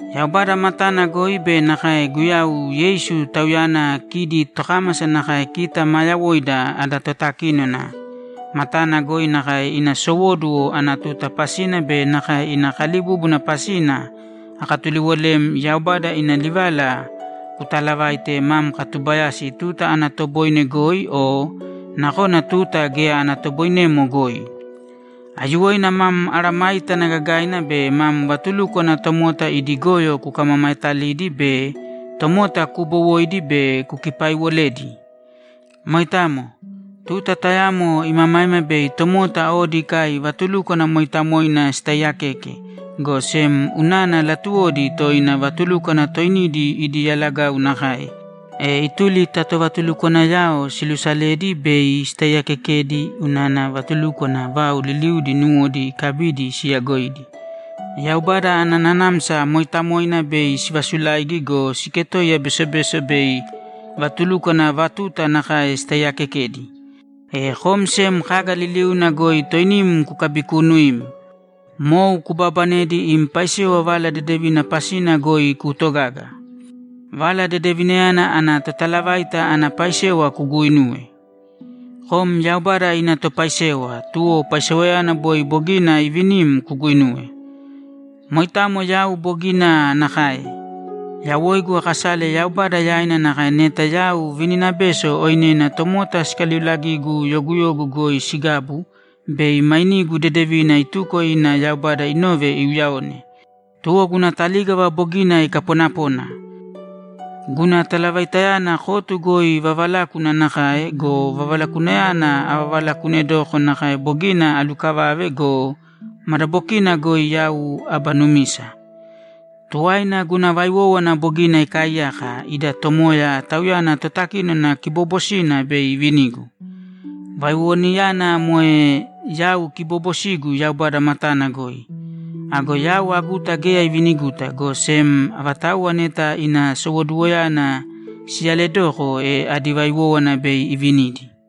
Yaubada matana goi be nakae Guyau Yeisu, Tauyana kidi tokámasa nakae kita maa yawoida ada totakínona, matana goi nakae ina sowóduwo ana tuta pasina be nakae ina kalibúbuna pasina akatuliwolem Yaubada ina livala kutaalavāite mam katubayasi tuta ana toboine goi o nakona tuta geya ana toboinemo goi. Aiyuwoina mam mesayágana gagaina be mam vatulúkwana tomota idi goyo kukamamaetalīdi be tomota kubowōidi be kukipaiwolēdi. Moitamo. Tuta tayamo imamaima bei tomota odi ikai vatulúkwana mooitamoina sitaaiyakeke, go sem unana latuwodi toina vatulúkwana toinidi idi yalagau nakae, e ituli ta tovatulukwanayao siluusaledi bei sitaiyaakekedi unana vatulukwana vau liliudi nuwodi ikabidi siyagoidi. Yaubada ana Nanamsa Mooitamoina bei sivasulaigi go, siketoiya besobeso bei vatulúkwana vatuta nakae sitaiyakekedi. E kom sem kaga liliuna goi toinim kukabikuunuīm. Mou kubaabanedi im paisewa Vala Dedevina pasina goi kuutogāga. Vala Dedevinayana ana totalavaita ana paisewa kuguuinūwe. Kom Yaubada ina topaisewa, tuwo paisewayana boi bogina ivinim kuguuinūwe. Moitamo yau bogina nakae. Yawoigu akasale Yaubada yaina nakae neta yau vininabeso oinena tomota sikaliuulagigu yoguyogu goi sigabu bei mainigu dedevina ituko ina Yaubada inove iuyaone. Tuwo guna talígava bogina ikaponapona. Guna talavaitayana kotu goi vavalákuna nakae go, vavalakunayana avavalakunedoko nakae bogina alukavave go, madabokina goi yau aba numisa. Tuwaina, guna vaiwówana bogina ikaaiyaka, ida Tomoya, Tauyana Totakínona kiboobosina, bei ivinigu. Vaiwowanayana moe yau kiboobosigu Yaubada matana goi. Ago yau aguta geya iviniguta, go sem avatauwa neta ina sowoduwoyana siyaledoko, e adi vaiwówana bei ivinidi.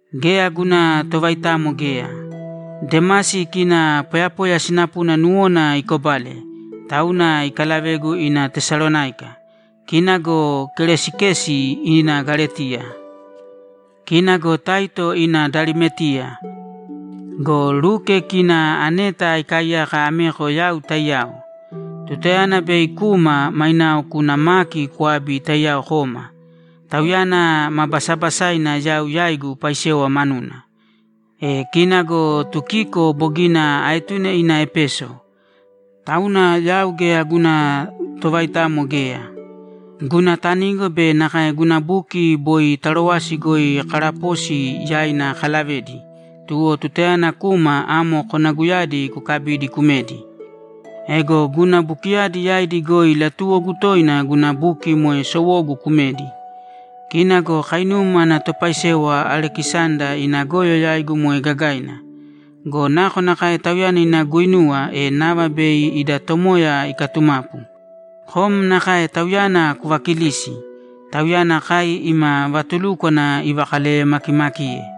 Geya guna tovaitamo geya. Demasi kina poyapoya sinapuna nuwona ikobale, tauna ikalavegu ina Tesalonáika. Kina go Keresikesi ina Galetiya. Kina go Taito ina Dalimetiya. Go Luke kina aneta ikaaiyaka ameko yau taiyao. Tutayana bei kuma, mainao kūna Maki kwābi taiyao kōma. Tauyana ma basabasaina yau yaigu paisewa manuna. E kina go Tukiko bogina aetune ina Epeso. Tauna yau geya guna tovaitamo geya. Guna tanigo be nakae guna buki boi Tarowasi goi Karaposi yaina akalavedi, tuwo tutayana kuma, amo konaguyadi kukabīdi kumēdi. Ego guna bukiyadi yaidi goi latuwogu toina guna buki moe sowogu kumedi. Kina go kainum ana topaisewa Alekisanda ina goyo yaigu moe gagaina. Go nakonakae tauyana ina guinuwa, e nava bei ida Tomoya ikatumapu. Kom nakae tauyana kuvakilīsi. Tauyana kai ima vatulúkwana ivakaleyemakimakiye.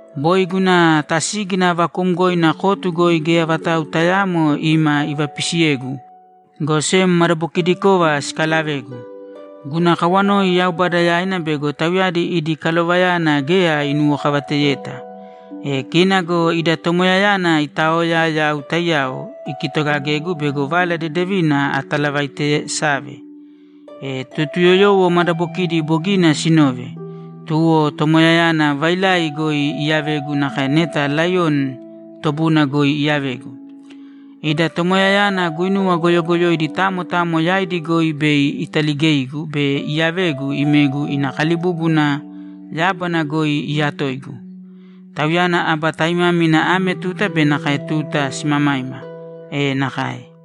Boi guna tasígina vakuumgoina kotu goi geya vatau tayaamo ima ivapisiyegu, go sem madabokidikova sikalavegu. Guna kawanoi Yaubada yaina bego tauyadi idi kalovayana geya inuwokavateyeta. E kina go ida Tomoyayana iitaoya yau taiyao, ikitogagegu bego Vala Dedevina atalavaitesave, e Totuyoyowo madabokidi bogina siinove. Tuwo Tomoyayana vailai goi iyavegu nakae neta laiyoni tobuna goi iyavegu. Ida Tomoyayana guinuwa goyogoyoidi tamo tamo yaidi goi bei italigeigu be iyavegu imegu ina kalibúbuna yábana goi iyatoigu. Tauyana aba taimámina ame tuta be nakae tuta simamaima! E nakae!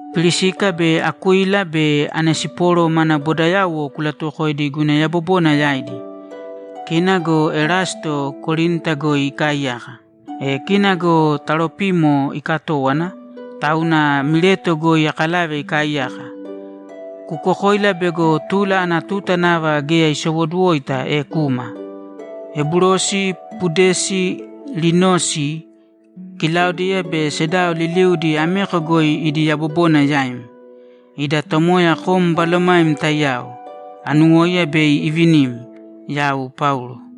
Pirisika be Akuila be Onesiporo mana bodayauwo kulatuwokōidi guna yabobona yaidi. Kina go Erasto Korinta goi ikaaiyaka. E kina go Taropimo ikatówana, tauna Mileto goi akalave ikaaiyaka. Kukokōila bego tula ana tuta nava geya isowoduwoita, e kūma. Ebulosi, Pudesi, Linosi, Kilaudiya be sedao liliudi ameko goi idi yabobona yaim. Ida Tomoya kom balomaim taiyao! Anuwóiya bei ivinim! Yau Paulo